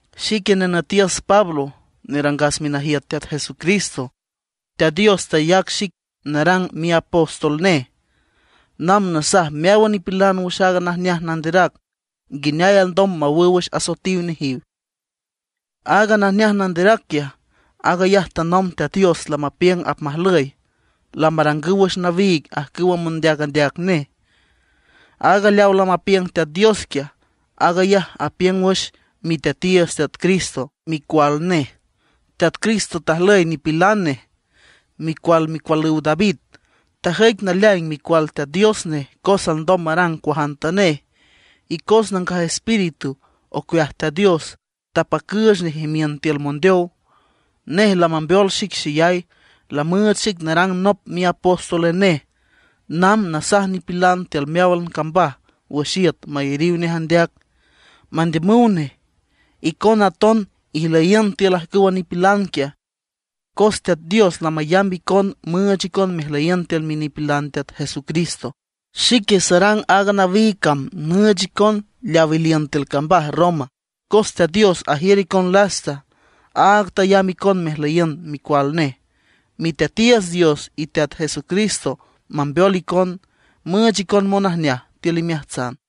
Xique nenütiüs Pablo nerangas minajiüt Teat Jesucristo. Teat Dios tayac xic narang miapóstol nej, namb nasaj meáwan nipilan wüx aaga najneaj nanderac nguineay alndom mawüw wüx asoetiw nejiw. Aaga najneaj nanderac quiaj, aag ayaj tanomb Teat Dios lamapiüng apmajlüy, lamarangüw wüx nawiig ajcüw mondeac andeac nej. Aaga leawa lamapiüng Teat Dios quiaj, aag ayaj apiüng wüx Miteatiiüts Teat Cristo, micual nej. Teat Cristo tajlüy nipilan nej, micual micualüw David. Tajüic naleaing Micual Teat Dios nej cos alndom marang cuajantanej, y cos Nangaj Espíritu ocueaj Teat Dios tapacüüch nej imiün tiül mondeow. Nej lamambeol xic xeyay, lamüüch xic narang nop miapóstol nej namb nasaj nipilan tiül meáwan cambaj wüx iüt mayariw nej andeac, mandiümüw nej. Icona aton ijlüyiün tiül ajcüwa nipilan quiaj, cos Teat Dios lamayamb icon müüch icon mejlüyiün tiül minipilan Teat Jesucristo. Xique sarang aaga nawiig cam nüüch icon leawa iliün tiül cambaj Roma, cos Teat Dios ajiür icon lasta, aag tayamb icon mejlüyiün micual nej. Miteatiiüts Dios y Teat Jesucristo mambeol icon, müüch icon monajneaj tiül imeajtsan.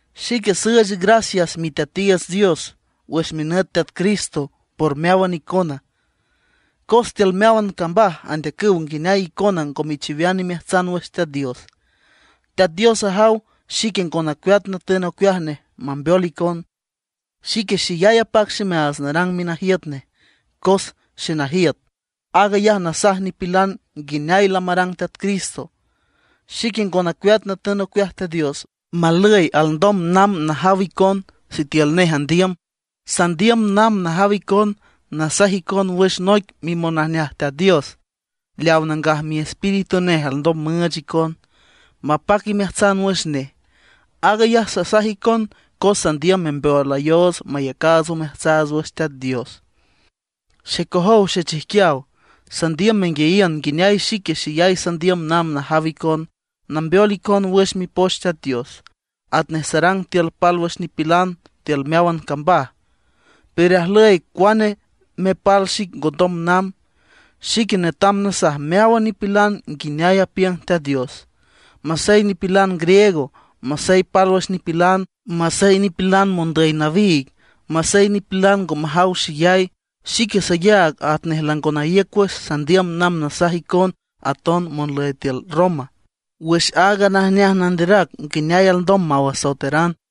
Xique süüch gracias Miteatiiüts Dios wüx minüt Teat Cristo por meáwan icona, cos tiül meáwan cambaj andeacüw nguineay icona ngo mechiwean imeajtsan wüx Teat Dios. Teat Dios ajaw xique ngo nacueat natün ocueaj nej mambeol icon. Xique xeyay apac ximeaats narang minajiüt nej; cos xenajiüt, aag ayaj nasaj nipilan nguineay lamarang Teat Cristo. Xique ngo nacueat natün ocueaj Teat Dios malüy alndom namb najaw icon, sitiül nej andiüm. Sandiüm namb najaw icon nasaj icon wüx noic mimonajneaj Teat Dios, leaw Nangaj Miespíritu nej alndom müüch icon, mapac imeajtsan wüx nej. Aag ayaj sasaj icon cos sandiüm membeolayoots mayacaats omeajtsaats wüx Teat Dios. Xecojow xechijquiaw, sandiüm menguiayiün nguineay xique xeyay sandiüm namb najaw icon, nambeol icon wüx Mipoch Teat Dios, atnej sarang tiül pálwüx nipilan tiül meáwan cambaj. Pero ajlüy cuane mepal xic ngondom namb. Xique netam nasaj meáwan nipilan nguineay apiüng Teat Dios, masey nipilan griego, masey pálwüx nipilan, masey nipilan mondüy nawiig, masey nipilan ngo majaw xeyay. Xique sayaag atnej lango naíüc wüx sandiüm namb nasaj icon aton monlüy tiül Roma, wüx aaga najneaj nanderac nguineay alndom maw asoeteran.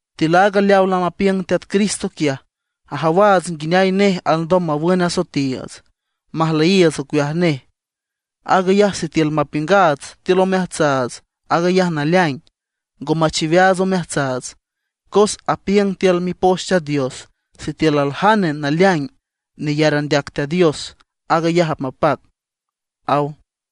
Tiül aaga leawa lamapiüng Teat Cristo quiaj, ajawaats nguineay nej alndom mawün asoetiiüts, majlüyiiüts ocueaj nej: aag ayaj sitiül mapiüngaats tiül omeajtsaats aag ayaj naleaing, ngo machiweaats omeajtsaats. Cos apiüng tiül Mipoch Teat Dios: “Sitiül aljane naleaing neyar andeac Teat Dios, aag ayaj apmapac”, aw.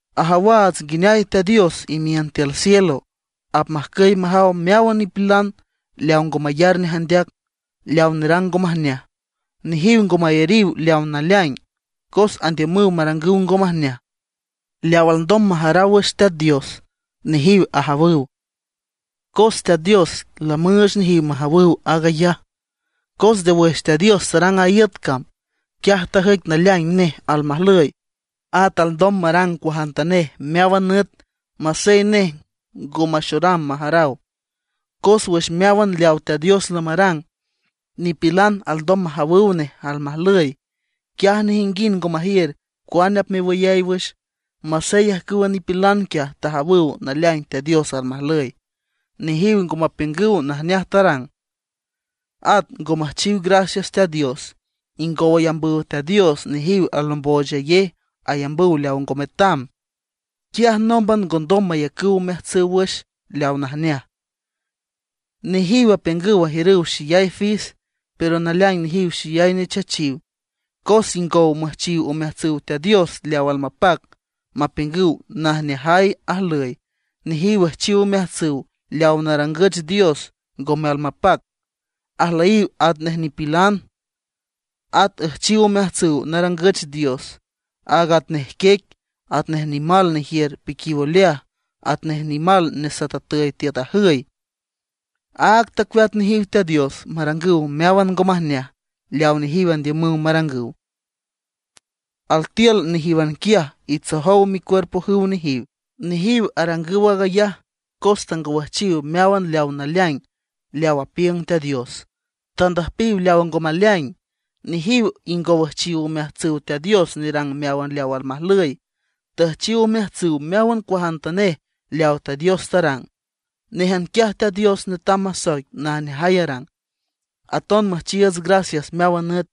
Ajawaats nguineay Teat Dios imiün tiül cielo, apmajcüy majaw meáwan nipilan leaw ngo mayar nej andeac, leaw nerang ngo majneaj. Nejiw ngo mayariw leawa naleaing, cos andiümüw marangüw ngo majneaj. Leaw alndom majaraw wüx Teat Dios, nejiw ajawüw. Cos Teat Dios lamüüch nejiw majawüw aag ayaj. Cos nde wüx Teat Dios tarang a iüt cam, quiaj tajüic naleaing nej almajlüy, at alndom marang cuajantanej meáwan nüt masey nej ngo maxoram majaraw. Cos wüx meáwan leawa Teat Dios lamarang, nipilan alndom majawüw nej almajlüy. Quiaj nejinguind ngo majiür cuane apmewüyay wüx. Masey ajcüwa nipilan quiaj ajawüw naleaing Teat Dios almajlüy, nejiw ngo mapiüngüw najneaj tarang, at ngo müjchiw gracias Teat Dios. Ingow ayambüw Teat Dios, nejiw alomboochayej, ayambüw leaw ngo metam. Quiaj nómban ngondom mayacüw omeajtsüw wüx leaw najneaj. Nejiw apiüngüw ajiürüw xeyay fis, pero naleaing nejiw xeyay nechachiw. Cos ingow müjchiw omeajtsüw Teat Dios leaw almapac, mapiüngüw najneajay ajlüy, nejiw üjchiw omeajtsüw leawa narangüch dios ngome almapac; ajlüyiw atnej nipilan. At üjchiw omeajtsüw narangüch dios, aag atnej quiec, atnej nimal nejiür piquiw oleaj, atnej nimal nesatatüy tiüt ajüy. Áag tacueat nejiw Teat Dios marangüw meáwan ngo majneaj leaw nejiw andiümüw marangüw; altiül nejíwan quiaj itsojow micuerpojüw nejiw. Nejiw arangüw aag ayaj cos tangowüjchiw meáwan aaga naleaing leaw apiüng Teat Dios; tandüjpiw leaw ngo maleaing. Nejiw ingow üjchiw omeajtsüw Teat Dios nerang meáwan leaw almajlüy, tüjchiw omeajtsüw meáwan cuajantanej leaw Teat Dios tarang. Néjan quiaj Teat Dios netam masoic najneajay arang, aton müjchiiüts gracias meáwan nüt.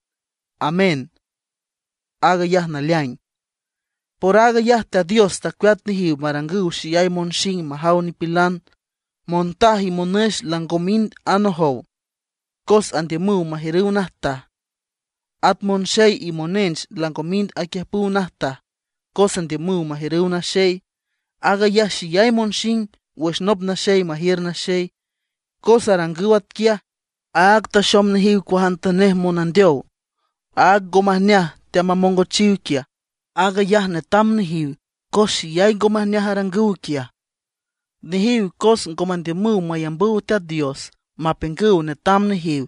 Amén, aag ayaj naleaing. Por aag ayaj Teat Dios tacueat nejiw marangüw xeyay monxing majaw nipilan. Montaj y monüx lango mind anojow, cos andiümüw majiürüw najtaj. At monxey y monench lango mind aquiüjpüw najtaj, cos andiümüw majiürüw naxey. Aag ayaj xeyay monxing wüx nop naxey majiür naxey. Cos arangüw atquiaj, áag taxom nejiw cuajantanej monandeow. Aaga ngo majneaj teamamongochiw quiaj, aag ayaj netam nejiw cos xeyay ngo majneaj arangüw quiaj. Nejiw cos ngo mandiümüw mayambüw Teat Dios mapiüngüw netam nejiw,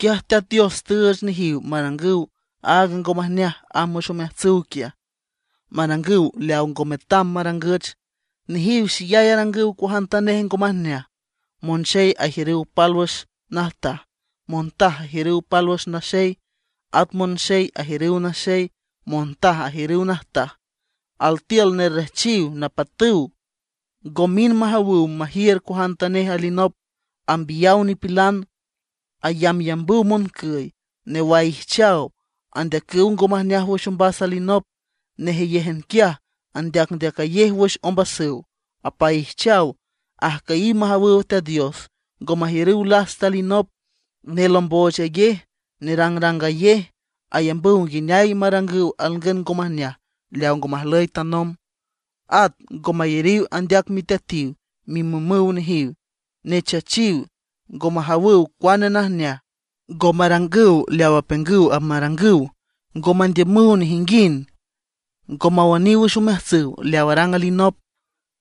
quiaj Teat Dios tüüch nejiw marangüw aaga ngo majneaj amb wüx omeajtsüw quiaj, marangüw leaw ngo metam marangüch. Nejiw xeyay arangüw cuajantanej ngo majneaj, monxey ajiürüw pálwüx najtaj, montaj ajiürüw pálwüx naxey. At monxey ajiürüw naxey, montaj ajiürüw najtaj. Altiül nerrejchiw, napatüw, ngo mind majawüw majiür cuajantanej alinop, ambiyaw nipilan. Ayambyambüw moncüy, newaijchaw; andeacüw ngo majneaj wüx ombas alinop. Nejeyéjan quiaj andeacndeacayej wüx ombasüw, apaijchaw; ajcüyiw majawüw Teat Dios, ngo majiürüw lasta alinop, nelomboochayej, nerangrangayej. Ayambüw nguineay marangüw alngün ngo majneaj leaw ngo majlüy tanomb; at ngo mayariw andeac miteatiw, mimümüw nejiw, nechachiw, ngo majawüw cuane najneaj, ngo marangüw leaw apiüngüw apmarangüw. Ngo mandiümüw nejinguind, ngo mawüniw wüx omeajtsüw leaw arang alinop,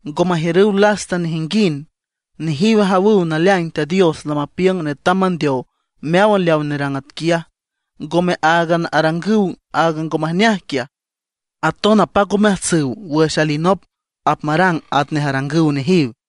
ngo majiürüw lasta nejinguind. Nejiw ajawüw naleaing Teat Dios lamapiüng netam mandeow meáwan leaw nerang atquiaj; ngome áagan arangüw aaga ngo majneaj quiaj, aton apac omeajtsüw wüx alinop apmarang atnej arangüw nejiw.